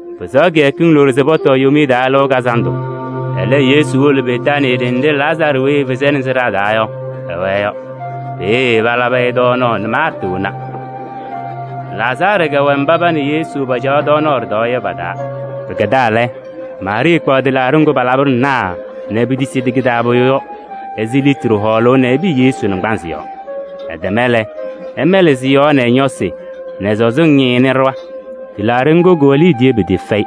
Pɩsɛɣ kɩyakɩŋ loɖo se pɔtɔɔ Yomiye Taa Lɩʋ Kazandʋ. Ɛlɛ, Yesu wolo Betaanii ɖenɖe Lazaarɩ weyi efezi-i nɛ sɩɖaa taa yɔ, ɛwɛɛ yɔ. Peeye palabɩ-ɩ tɔɔnaɣ nɛ Maarta wona. Lazaarɩ kɛwɛ mba pa nɛ Yesu paacaɣ ɖɩtɔɔyɛ yɔ pa-taa. Pɩkɛdaa lɛ, Maarɩɩ kpaɣ tɩlaaɖɩ ŋgʋ palabɩnɩ naarɩ nɛ petesidi kɩ-taa pʋyʋ yɔ ɛzɩ litri hɔɔlʋʋ yɔ nɛ ɛpɩyɩ Yesu naŋgbanzɩ yɔɔ. Ɛtɛma lɛ, ɛmɛlɩ sɩ-yɔɔ nɛ ɛ-ñɔsɩ nɛ sɔzɩŋ ñɛyɩnɩ ɖɩɣa. Tɩlaaɖɩ ŋgʋ, kɩwɛ liidiye pɩtɩɩfɛyɩ.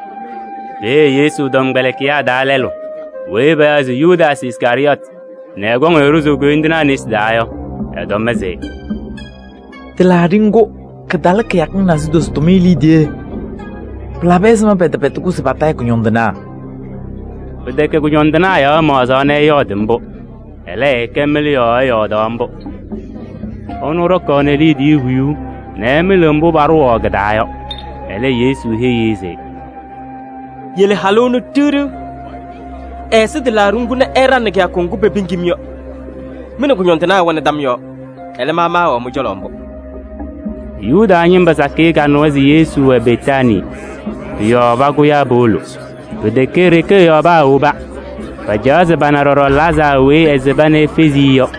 Peeye Yesu tɔmkpɛlɩkɩyaa taa lɛlʋ weyi payaɣ se Yudaasɩ Iskarɩyɔɔtɩ nɛ ɛkɔŋ-ɩ ɖʋzʋʋ koyindinaa nesi taa yɔ, ɛtɔm se: “Tɩlaaɖɩ ŋgʋ, kɩtalɩ kɩyakɩŋ nasidozo tʋmɩyɛ liidiye! Pɩlabɩ ɛzɩma pɛtɛpɛdɩ-kʋ se patayɩ kʋñɔndɩnaa?” Pɩtɛkɛ kʋñɔndɩnaa yɔɔ ɛmaɣzaɣ nɛ ɛyɔɔdɩ mbʋ. Ɛlɛ, ɛkɛ mɩlʋ yɔɔ ɛyɔɔdaɣ mbʋ: ɛnʋ ɖɔkaɣnɩ liidiye huyuu nɛ ɛmɩlɩɣ mbʋ paɖʋwaɣ kɩ-taa yɔ. Ɛlɛ Yesu heyi-i se: “Yele halʋ ɛnʋ ɖiɣ ɖiɣ! Ɛɛsɩ tɩlaaɖɩ ŋgʋ nɛ ɛɖaŋnɩ kɩyakʋ ŋgʋ pepiŋ-m yɔ. Mɩ nɛ kʋñɔndɩnaa ɩwɛnɩ tam yɔɔ. Ɛlɛ, ma maawɛɣ mɩ-cɔlɔ mbʋ.” Yuda ñɩma sakɩyɛ kanɩwa se Yesu wɛ Betaanii. Pʋ-yɔɔ pakʋyaa powolo. Pɩtɛkɛ e-ɖeke ɛ-yɔɔ paawoba. Pacaɣaɣ se pana ɖɔɖɔ Lazaarɩ weyi ɛsɩba nɛ efezi-i yɔ.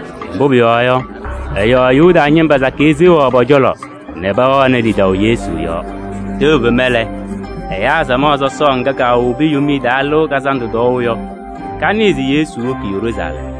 Mbʋ pʋyɔɔ yɔ, ɛ-yɔɔ Yuda ñɩma sakɩyɛ seɣaɣ pɔ-cɔlɔ nɛ pɛwɛɣnɩ lidaʋ Yesu yɔɔ. Tɛʋ fema lɛ, ɛyaa samaɣ sɔsɔɔ ŋga kowobi Yomiye Taa Lɩʋ Kazandʋ tɔɔʋ yɔ, kanɩɩ se Yesu woki Yeruusalɛm.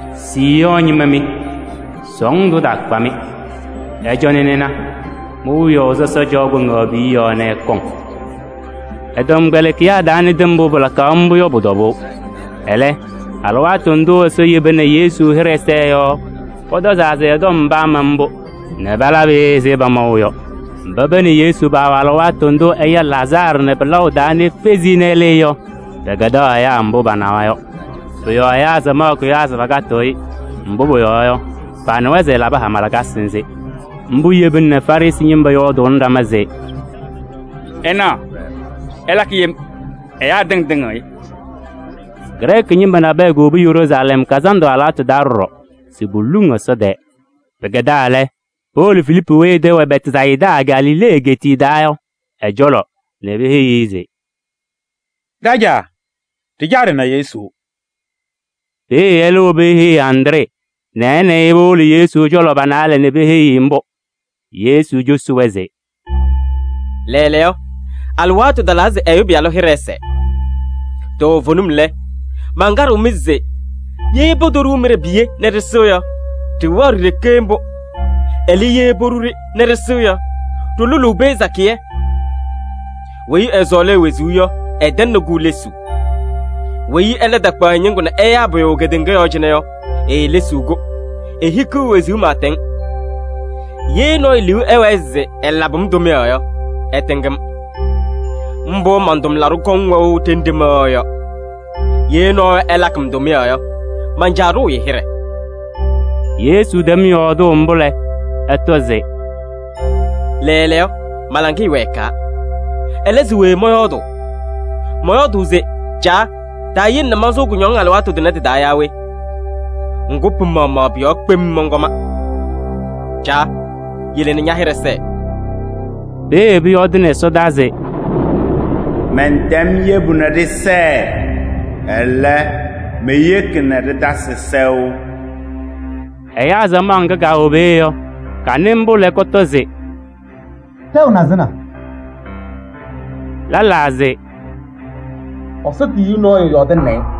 “Siiyɔɔ ñɩma mɩ! Sɔɔndʋ ɛtaakpa-mɩ! Ɩcɔnɩ ɩna, mi-wiyaʋ sɔsɔ caɣ kpaŋaɣ piye nɛ ɛkɔŋ.” Ɛ-tɔmkpɛlɩkɩyaa taanɩdɩ mbʋ pɩlakaɣ mbʋ yɔ pʋ-tɔbʋʋ. Ɛlɛ, alɩwaatʋ ndʋ Ɛsɔ yeba nɛ Yesu hɩɖɛ sɛɛ yɔ, pɔtɔzaa se ɛ-tɔm paama mbʋ, palabɩ-ɩ ɛzɩ pamaʋ yɔ. Mba pa nɛ Yesu paawɛ alɩwaatʋ ndʋ ɛya Lazaarɩ nɛ pɩlaʋ taa nɛ efezi-i nɛ ɛlɩɩ yɔ, pɛkɛdaɣ ɛyaa mbʋ panawa yɔ. Pʋ-yɔɔ ɛyaa samaɣ kʋyaa se pakatɩɣ-ɩ, mbʋ pʋyɔɔ yɔ, panɩwa se ɛlabɩ hama lakasɩ nzɩ. Mbʋ yebina nɛ Farɩsɩ ñɩma yɔɔdʋʋnɩ ɖama se: “Ɩnaɣ, ɩlakɩ yem: ɛyaa tɩŋa tɩŋɩɣ-ɩ!” Grɛɛkɩ ñɩma nabɛyɛ kowobi Yeruusalɛm kazandʋ alɩwaatʋ taa ɖɔɖɔ se poluŋ Ɛsɔ tɛɛ. Pɩkɛdaa lɛ, powolo Filiipu weyi ɛ-tɛ wɛ Bɛtsayɩda Galilee egeetiye taa yɔ ɛ-cɔlɔ nɛ peheyi-i se: “Ɖajaa! Ɖɩcaɣ ɖɩna Yesu.” Peeye ɛlɛ wobi eheyi Andree nɛ ɛ nɛ ɩ powolo Yesu cɔlɔ pa-naalɛ nɛ peheyi-i mbʋ. Yesu cosi-wɛ se: “Lɛɛlɛɛyɔ, alɩwaatʋ talaa se Ɛyʋ Pɩyalʋ hɩɖɛ ɛsɛɛ. Toovenim lɛ, mankaɖɩɣ-mɩ se: ye potoɖuu mɩɖɛ piye nɛ ɖɩsɩ yɔ, ɖɩwɛɣ ɖi-ɖeke mbʋ. Ɛlɛ, ye poɖu-ɖɩ nɛ ɖɩsɩ yɔ, ɖɩlʋlʋʋ pee sakɩyɛ. Weyi ɛsɔɔlɩ e-wezuu yɔ, ɛtɛŋnɩ-kʋ lesuu. Weyi ɛlɛ takpaɣ ɛ-ñɩŋgʋ nɛ ɛyaa pʋyʋ kedeŋa yɔɔ cɩnɛ yɔ, eelesiɣ-kʋ, ehikiɣ wezuu pɩɩtɛŋ. Ye nɔɔyʋ liu ɛwɛɛ se ɛlabɩ-m tʋmɩyɛ yɔ, ɛtɩŋ-m. Mbʋ man-tʋmlaɖʋ kɔŋ wɛʋ ɖenɖe mɛwɛɣ yɔ. Ye nɔɔyʋ ɛlakɩ-m tʋmɩyɛ yɔ, man-Caa ɖʋʋ-ɩ hɩɖɛ.” Yesu tɛm yɔɔdʋʋ mbʋ lɛ, ɛtɔ se: “Lɛɛlɛɛyɔ, ma-laŋɩyɛ wɛɛkaa. Ɛlɛ, se we mɔyɔɔdʋʋ? Mɔyɔɔdʋʋ se: Caa! Taayele nɛ mansʋʋ kʋñɔŋ alɩwaatʋ tʋnɛ tɩ-taa yaa we? Ŋgʋ, pɩ-maɣmaɣ pʋ-yɔɔ kpem mɔnkɔma. Caa! Yele nɛ ña-hɩɖɛ sɛɛ!” Peeye pʋyɔɔdɩnɩ ɛsɔdaa se: “Mɛntɛm yebu nɛ ɖɩsɛɛ, ɛlɛ, meyeki nɛ ɖɩtasɩ sɛʋ!” Ɛyaa samaɣ ŋga kaawɛ peeye yɔ, kanɩ mbʋ lɛ, kɔtɔ se: “Tɛʋ nazɩna!” Lɛlaa se: “Ɛsɔ tiyiyu nɔɔyʋ yɔɔdɩnɩnɩ-ɩ!”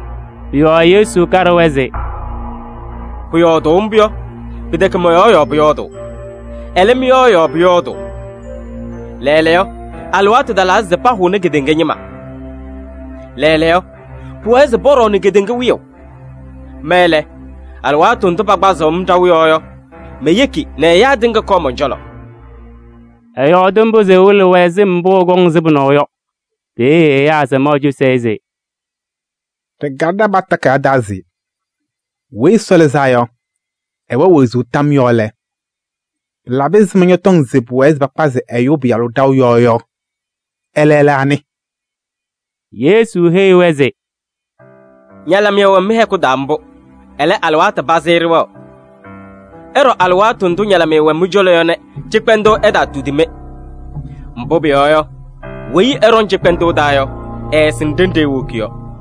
Pʋ-yɔɔ Yesu kaɖɩ-wɛ se: “Pʋyɔɔdʋʋ mbʋ yɔ, pɩtɛkɛ mɔ-yɔɔ yɔɔ pʋyɔɔdʋʋ, ɛlɛ, mɩ-yɔɔ yɔɔ pʋyɔɔdʋʋ. Lɛɛlɛɛyɔ, alɩwaatʋ talaa se pahʋnɩ kedeŋa ñɩma. Lɛɛlɛɛyɔ, pʋwɛɛ se pɔɖɔɔnɩ kedeŋa wiyaʋ. Ma lɛ, alɩwaatʋ ndʋ pakpazɩɣ-m ɖaʋ yɔɔ yɔ, meyeki nɛ ɛyaa tɩŋa kɔɔ mɔn-cɔlɔ.” Ɛyɔɔdɩ mbʋ se ɛwɩlɩ-wɛ sɩm mbʋ ɛkɔŋ sɩbʋ yɔ. Peeye ɛyaa samaɣ cosi-i se: “Ɖɩkalɩ ɖa-paɣtʋ takayaɣ taa se Weyi Ɛsɔ Lɩzaa yɔ, ɛwɛɣ wezuu tam yɔɔ lɛ, ɛzɩma ñɔtɔŋ se pʋwɛɛ se pakpazɩ Ɛyʋ Pɩyalʋ ɖaʋ yɔɔ yɔ? Ɛlɛ lɛ anɩ?” Yesu heyi-wɛ se: “Ñalɩmɩyɛ wɛ mɩ-hɛkʋ taa mbʋ, ɛlɛ, alɩwaatʋ pazɩ ɖɩwɛɣ. Ɩɖɔ alɩwaatʋ ndʋ ñalɩmɩyɛ wɛ mɩ-cɔlɔ yɔ nɛ cɩkpɛndʋʋ ɛtaatudi-mɩ. Mbʋ pʋyɔɔ yɔ, weyi ɛɖɔŋ cɩkpɛndʋʋ taa yɔ, ɛɛsɩŋ ɖenɖe ewoki yɔ.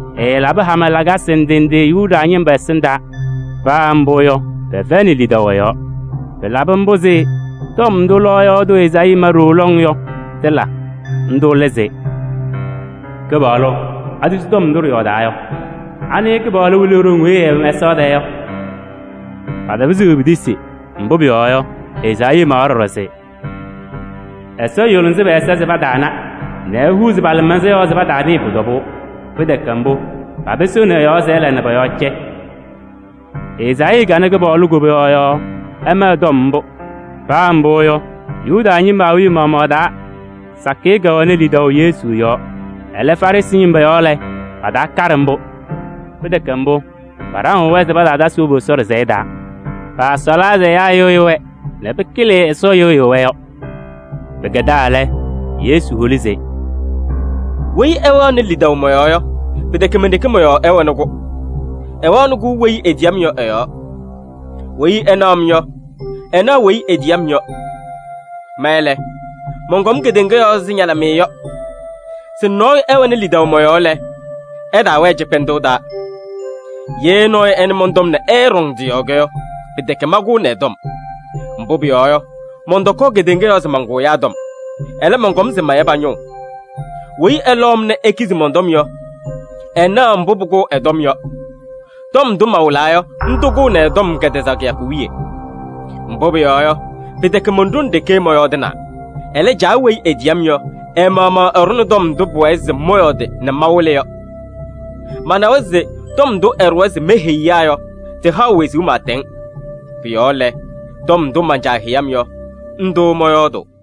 Ɛɛlabɩ hama lakasɩ ndɩ ndɩ Yuda ñɩma ɛsɩndaa, paa mbʋ yɔ, pɛfɛyɩnɩ lidaʋ ɛ-yɔɔ. Pɩlabɩ mbʋ se tɔm ndʋ lɔɔyaɣ tʋ Ezaayii ma ɖooo lɔŋ yɔ, tɩla. Ndʋ lɛ se: “Kɩpaɣlʋ! Atisi tɔm ndʋ ɖɩyɔɔdaa yɔ? Anɩ Kɩpaɣlʋ wɩlɩ e-ɖoŋ weyi ɛɛwɛ mɛsaɣ tɛɛ yɔ?” Patapɩzɩɣ se petisi, mbʋ pʋyɔɔ yɔ, Ezaayii mawa ɖɔɖɔ se: “Ɛsɔ yʋlɩsɩ pɛ-ɛza se pataana nɛ ehuuzi pa-lɩmaɣza yɔɔ se pataanɩɩ pʋ-tɔbʋʋ. Pɩtɛkɛ mbʋ, papɩsɩɣnɩ ɛ-yɔɔ nɛ ɛla nɛ pɔ-yɔɔ cɛ.” Ezaayii kana Kɩpaɣlʋ koboyaɣ yɔɔ ɛma ɛ-tɔm mbʋ. Paa mbʋ yɔ, Yuda ñɩma awiya maɣmaɣ taa sakɩyɛ kɛwɛnɩ lidaʋ Yesu yɔɔ. Ɛlɛ, Farɩsɩ ñɩma yɔɔ lɛ, pataakaɖɩ mbʋ. Pɩtɛkɛ mbʋ, paɖaŋɩɣ-wɛ se pataatasɩ wobu Ɛsɔ ɖɩsɛyɛ taa. Paasɔɔlaa se ɛyaa ɛyɩɣyɩ-wɛ nɛ pɩkɩlɩ Ɛsɔ yɩɣyʋʋ-wɛ yɔ. Pɩkɛdaa lɛ, Yesu holi se: “Weyi ɛwɛɣnɩ lidaʋ mɔ-yɔɔ yɔ, pɩtɛkɛ men-ɖeke mɔ-yɔɔ ɛwɛnɩ-kʋ, ɛwɛɣnɩ-kʋ weyi etiyi-m yɔ ɛ-yɔɔ. Weyi ɛnaɣ-m yɔ, ɛnaɣ weyi etiyi-m yɔ. Ma lɛ, mɔnkɔm kedeŋa yɔɔ ɛzɩ ñalɩmɩyɛ yɔ se nɔɔyʋ ɛwɛnɩ lidaʋ mɔ-yɔɔ lɛ, ɛtaawɛɛ cɩkpɛndʋʋ taa. Ye nɔɔyʋ ɛnɩ mɔn-tɔm nɛ ɛɛɖɔŋ tɩ-yɔɔ yɔ, pɩtɛkɛ mankʋʋnɩ ɛ-tɔm. Mbʋ pʋyɔɔ yɔ, mɔntɔkɔɔ kedeŋa yɔɔ se mankʋ ɛyaa tɔm, ɛlɛ, mɔnkɔm se maya pa-ñʋʋ. Weyi ɛlɔʋ-m nɛ ekizi mɔn-tɔm yɔ, ɛnaɣ mbʋ pʋkʋʋ ɛ-tɔm yɔ: tɔm ndʋ mawɩlaa yɔ, ndʋ kʋʋnɩ ɛ-tɔm kɛtɛzaɣ kɩyakʋ wiye. Mbʋ pʋyɔɔ yɔ, pɩtɛkɛ mon-ɖoŋ ɖeke mɔyɔɔdɩnaa. Ɛlɛ, Caa weyi etiyi-m yɔ, ɛ-maɣmaɣ ɛɖʋnɩ tɔm ndʋ pʋwɛɛ se mɔyɔɔdɩ nɛ mawɩlɩ yɔ. Manawa se tɔm ndʋ ɛɖʋwa se meheyi ɛyaa yɔ, tɩhaɣ wezuu pɩɩtɛŋ. Pʋ-yɔɔ lɛ, tɔm ndʋ man-Caa heyi-m yɔ, ndʋ mɔyɔɔdʋʋ.”